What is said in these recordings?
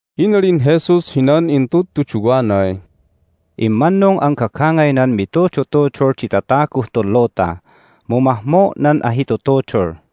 Inalin Jesus hinan intudtuduwanay, "Immannung an gagangaynan mitudutudul di tataguh tun luta, mu mahmo' nan ahitutudul!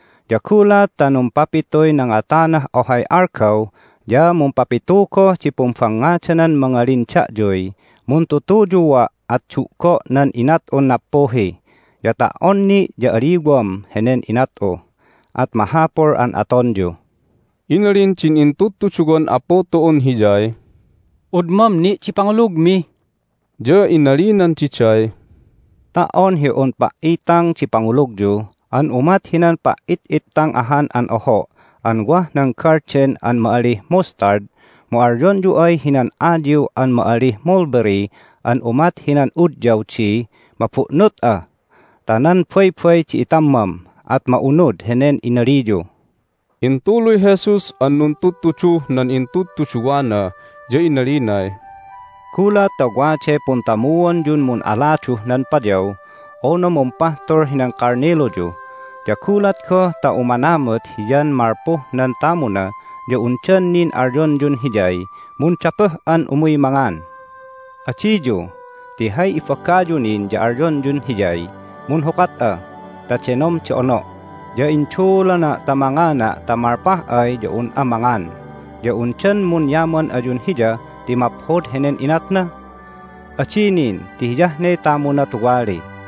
Ya gulat ta numpapituy nangatanah ohay algaw ya mumpapitu goh di pumbangngadanan mangalin da'yuy, Muntutuyua', at du'go' nan inat'un nappuhi, ya ta"on ni' ya aliwam henen inat'u! at mahapul an atonyu." Inalin din intudtuduwan Apu tu'un Hiyay, "Udmam ni' di pangulugmi!" Ya inalinan diday, "Ta"on hi un pa"itang di pangulugyu an umat hinan pa"itang ahan an oho' an wah nan galden an ma'alih mustard mu alyonyu ay hinan ayiw an ma'alih mulberry an umat hinan udyaw di, Mabu'nut'a ta nan baybay di itammam! at ma'unud henen inaliyu." Intuluy Jesus an nuntudtuduh nan intudtuduwana, ya inalinay, "Gulat ta waday puntamuonyun mun'aladuh nan payaw unu mumpahtul hinan kalniluyu, ya gulat goh ta umanamut hiyan malpuh nan tamuna ya undan nin alyonyun hiyay, Mundapuh'an umuy mangan? Adiyu! Ti hay ibagayu nin ya alyonyun hiyay, Munhukat'a ta denom di ono', ya induulana' ta mangana' ta malpah ya un'a mangan. Ya undan munyaman ayun hiya ti maphod henen inatna? Adi nin ti hiyah ne tamuna tuwali.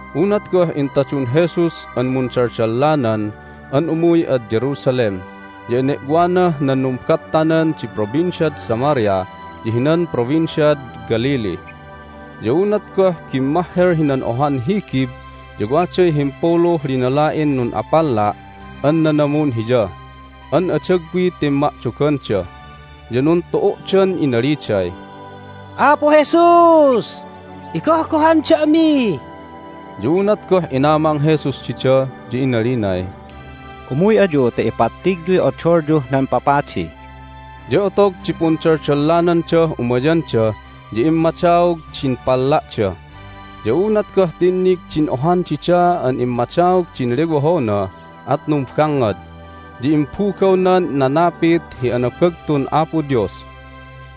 Unat goh intadun Jesus an mundaldallanan an umuy ad Jerusalem ya ene'wanah nan numbattanan di Provinciad Samaria ya hinan Provinciad Galilee. Ya unat goh bimmahhel hinan ohan higib ya waday himpuluh linala'in nun'apalla' an nanamun Hiya an adagwiy timma'doganda, ya nuntu'u'dan inaliday, "Apu Jesus, igohgohan da'mi!" Ya unat goh inamang Jesus dida ya inalinay, "Umuy ayu ta ipattigyuy odolyuh nan papadi." Ya otog di pundaldallanandah umayanda ya immadaog din palla'da. Ya unat goh tinnig din ohan dida an immadaog din lewohona at numbangngad, ya imbugawnan nanapit hi anabagtun Apo Dios.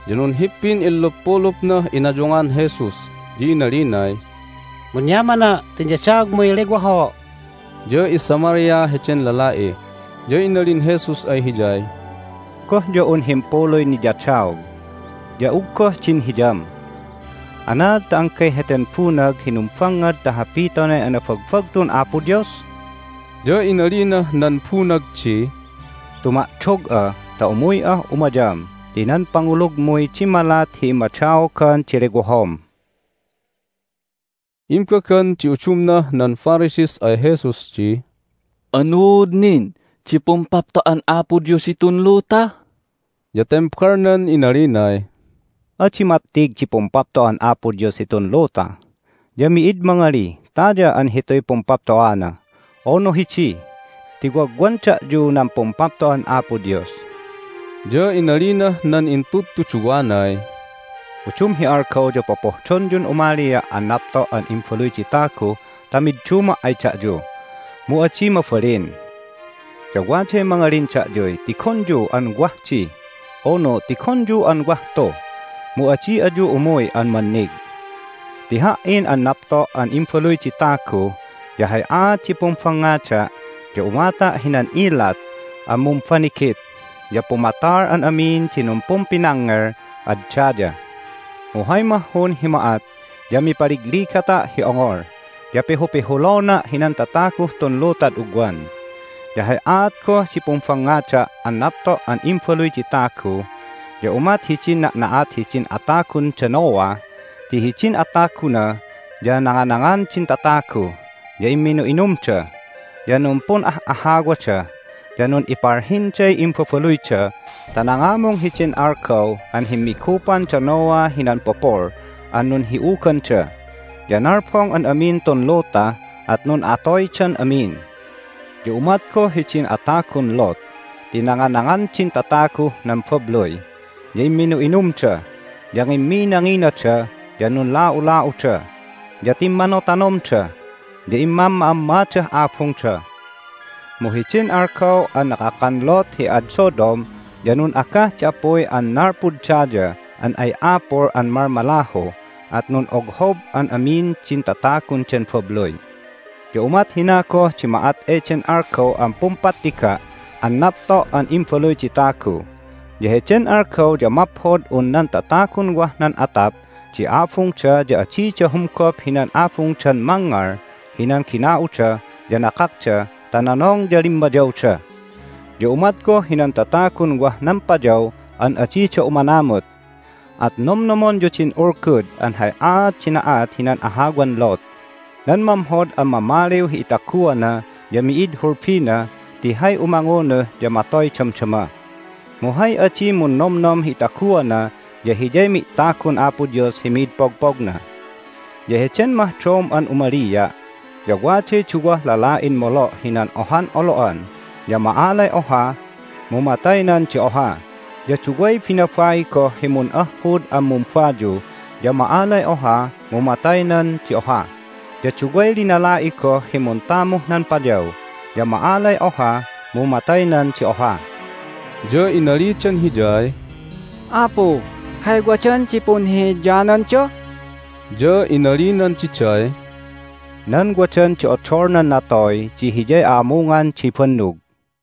Ya nunhippin inluppulupnah inayungan Jesus, ya inalinay, "Munyamana' ti inyadaogmuy lewoho'!" Ya iSamaria heden lala'i. Ya inalin Jesus ay hiyay, "Goh ya un himpuluy niyadaog? Ya uggoh din hiyam? Anaad ta anggay heten bunag hi numbangngad ta hapitonay anabagbagtun Apo Dios?" Ya inalinah nan bunag di, "Tuma'dog'a ta umuy'ah umayam ti nan pangulugmuy dimmalat hi immadaogan di lewohom." Imbagan di udumnah nan Pharisees ay Jesus di, "Anuud nin di Pumpapto'an Apo Dios hitun luta?" Ya tembalnan inalinay, "Adi mattig di Pumpapto'an Apo Dios hitun luta. Ya mi'id mangalih, Taya an hituy Pumpapto'ana! unu, Hidi! ti wagwan da'yu nan Pumpapto'an Apo Dios." Ya inalinah nan intudtuduwanay, "Udum hi algaw ya popohdonyun umalia' an napto' an Imbaluy di Tagu ta midduma' ay da'yu, mu adi mabalin. Ya waday mangalin da'yuy, Tigonyu an wah di! unu, Tigonyu an wah tu! mu adi ayu umuy an mannig. Ti Ha"in an napto' an Imbaluy di Tagu ya hay aat di pumbangngada' ya umata' hinan ilat an mumbanigit, ya pumatal an amin di numpumpinangngel ad daya. Mu hay mahhun hi ma'at ya mipaligligata' hi ongol, ya pihupihulona' hinan tataguh tun lutad ugwan. Ya hay aat goh di pumbangngada' an napto' an Imbaluy di Tagu ya umat hidin na'na'at hidin atagun da Noah ti hidin ataguna ya nanganangan din tatagu, ya imminu'inumda, ya numpun'ah'ahawada, ya nun'ipalhinday imbabaluyda ta nangamung hidin algaw an himmigupan da Noah hinan pupul an nunhi'uganda. Ya nalbong an amin tun luta, at nun'atoydan amin. Ya umat goh hidin atagun Lot ti nanganangan din tataguh nan babluy, ya imminu'inumda, ya ngimminanginada, ya nunla'ula'uda, ya timmanotanomda, ya immamma'ammadah abungda. Mu hidin algaw an nakakan Lot hi ad Sodom ya nun'agah di apuy an nalpud daya an ay apul an malmalahu, at nun'oghob an amin din tatagun den babluy. Ya umat hina goh di ma'at eden algaw an pumpattiga' an napto' an Imbaluy di Tagu. Ya heden algaw ya maphod un nan tatagun wah nan atap di abungda ya adida humgop hinan abungdan mangngal hinan gina'uda ya nakakda ta nonong ya limmayawda. Ya umat goh hinan tatagun wah nan payaw an adida umanamut. At nomnomonyu din ulgud an hay aat di na'at hinan ahawan Lot! Nan mamhod an mamaliw hi itaguana ya mi'id hulbina ti hay umangunuh ya matoy damdama. Mu hay adi munnomnom hi itaguana ya hiyay mi'tagun Apo Dios hi mid pogpogna. Ya heden mahdom an umalia' ya waday duwah lala'in molo' hinan ohan olo'an, ya ma'alay oha, mu mataynan di oha. Ya duway binabai goh hi mun'ahhud an mumbayu, ya ma'alay oha, mu mataynan di oha. Ya duway linala'i goh hi muntamuh nan payaw, ya ma'alay oha, mu mataynan di oha." Ya inalidan Hiyay, "Apu, hay wadan di punhihiyananda?" Ya inalinan diday, "Nan wadan di odol nan natoy di hiyay a'amungan di bannug."